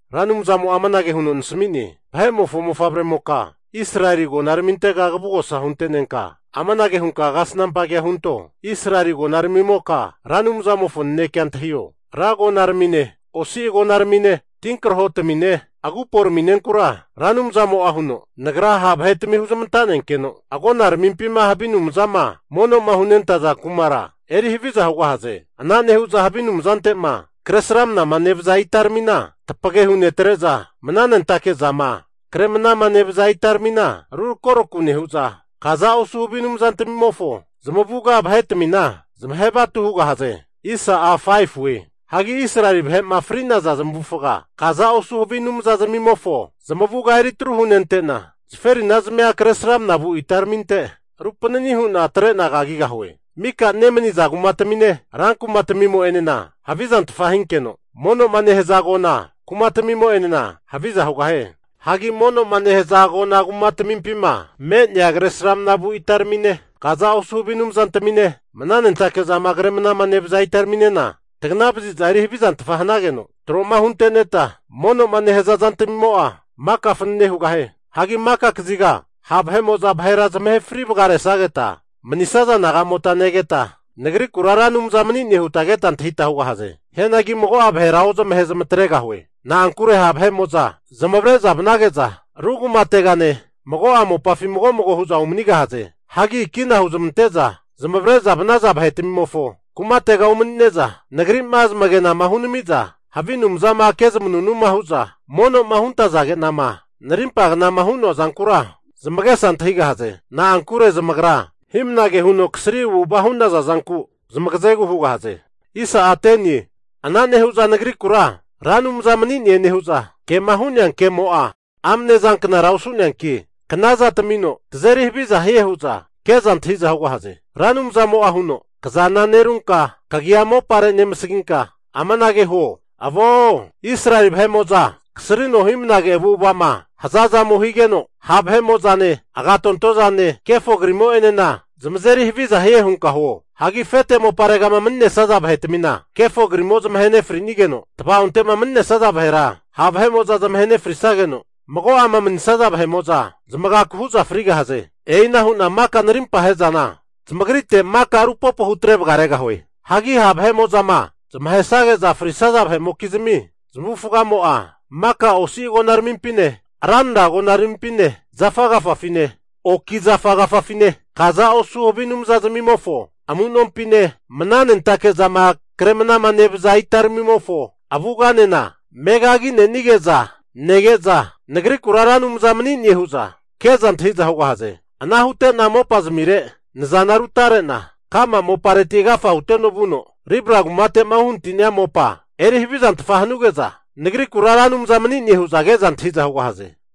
Ra Anumzamo'a amanage huno nasami'ne, Vahe'mofo mofavremoka, Israeli agonaramintega kavugosa hunte'nenka amanage hunka kasnampa kea hunto, Israeli agonaramimoka Ra Anumzamofo nanekea antahio! Ra agonaramine osi agonaramine, tinkrahotamine, aguporaminenkura Ra Anumzamo'a huno, Nagra ha' vahetami huzmanta'nenkeno agonaramimpima havi anumzama mono'ma hunentaza kumara eri haviza hugahaze. Ana nehu'za havi anumzante'ma kresramnama nevaza itaramina, tapagehu netre'za mnanentake zama kre'mnama nevaza itaramina rurakoraku nehu'za, kaza osu havi anumzantmimofo zamavuga vahetmina zamahe vatu hugahaze. Hagi Israeli vahe'ma fri'naza zamavufaga kaza osu havi anumzazmimofo zamavuga eri tru hunente'na, zaferinazmia kresramna vu itaraminte rupanani hu'na atrena kagigahue. Mika nemaniza kumatamine, rankumatmimo'enena havizantfa hinkeno, mono'ma nehaza agona kumatmimo'enena haviza hugahie. Hagi mono'ma nehaza agona kumatmimpima me'nea kresramna vu itaramine, kaza osu havi anumzantamine, mnanentake zama kre mnama nevaza itaraminena taganavaziza eri havizantfa hanageno, tro'ma hunteneta mono'ma nehaza zantmimo'a maka fanane hugahie. Hagi maka kaziga ha' vahe'mo'za vahera zamahe fri vagaresageta, manisaza nagamota negeta Nagrikura Ra Anumza mani'ne huta keta antahita hugahaze. Hianagi mago'a vahera ozamahe zamatregahue. Na'ankure ha' vahe'mo'za zamavare'za vanage'za ru kumategane mago'a mopafi mago mago hu'za umanigahaze. Hagi kina huzamante'za zamavare'za vanaza vahetmimofo kumatega umani'neza, Nagri'ma zamagenama hunenamiza havi anumzama kezamanunuma hu'za mono'ma huntazage'nama narimpa knama hu'noa zankura zamagesa antahigahaze. Na'ankure zamagra hi'mnage huno kasri avu'ava hu'naza zanku zamagazegu hugahaze. Ana nehu'za Nagrikura Ra Anumza mani'ne nehu'za, kema hu'nea kemo'a amne zanknara osu'neanki, knaza tamino tazeri haviza hie hu'za ke'za antahi'za hugahaze. Ra Anumzamo'a huno, Kazana nerunka kagia mopare nemasaginka amanage huo, Avo! Israeli vahe'mo'za kasrino hi'mnage avu'ava'ma hazazamo higeno ha' vahe'mo'zane, agatonto zane, kefo kriramimo'enena zamazeri haviza hie hunka huo. Hagi afete moparegama mani'nesaza vahetmina kefo krimo zamahe nefrinigeno, tavaonte'ma manisaza vahera ha' vahe'mo'za zamahe nefrisageno, mago'ama manisaza vahe'mo'za zamagaku hu'za frigahaze. E'ina hu'na maka narimpa ahe'zana zamagrite maka rupopo hutre vagaregahue. Hagi ha' vahe'mo'zama zamahesage'za frisaza vahe'mokizmi zamavufagamo'a maka osi agonaramimpine, ranra agonaramimpine, zafa agafafine, anina kuronkuro hu oki zafa agafafine, kaza osu havi anumzazmimofo amu'nompine, mnanentake'zama kremnama nevaza itaramimofo avuganena megagi'nenige'za nege'za Nagrikura Ra Anumza mani'ne hu'za ke'za antahi'za hugahaze. Ana hute'na mopazmire nazana rutare'na ka'ma mopareti agafa huteno vuno Ribla kumate'ma uhanati'nia mopa eri havizantfa hanuge'za, Nagrikura Ra Anumza mani'ne hu'za ke'za antahi'za hugahaze.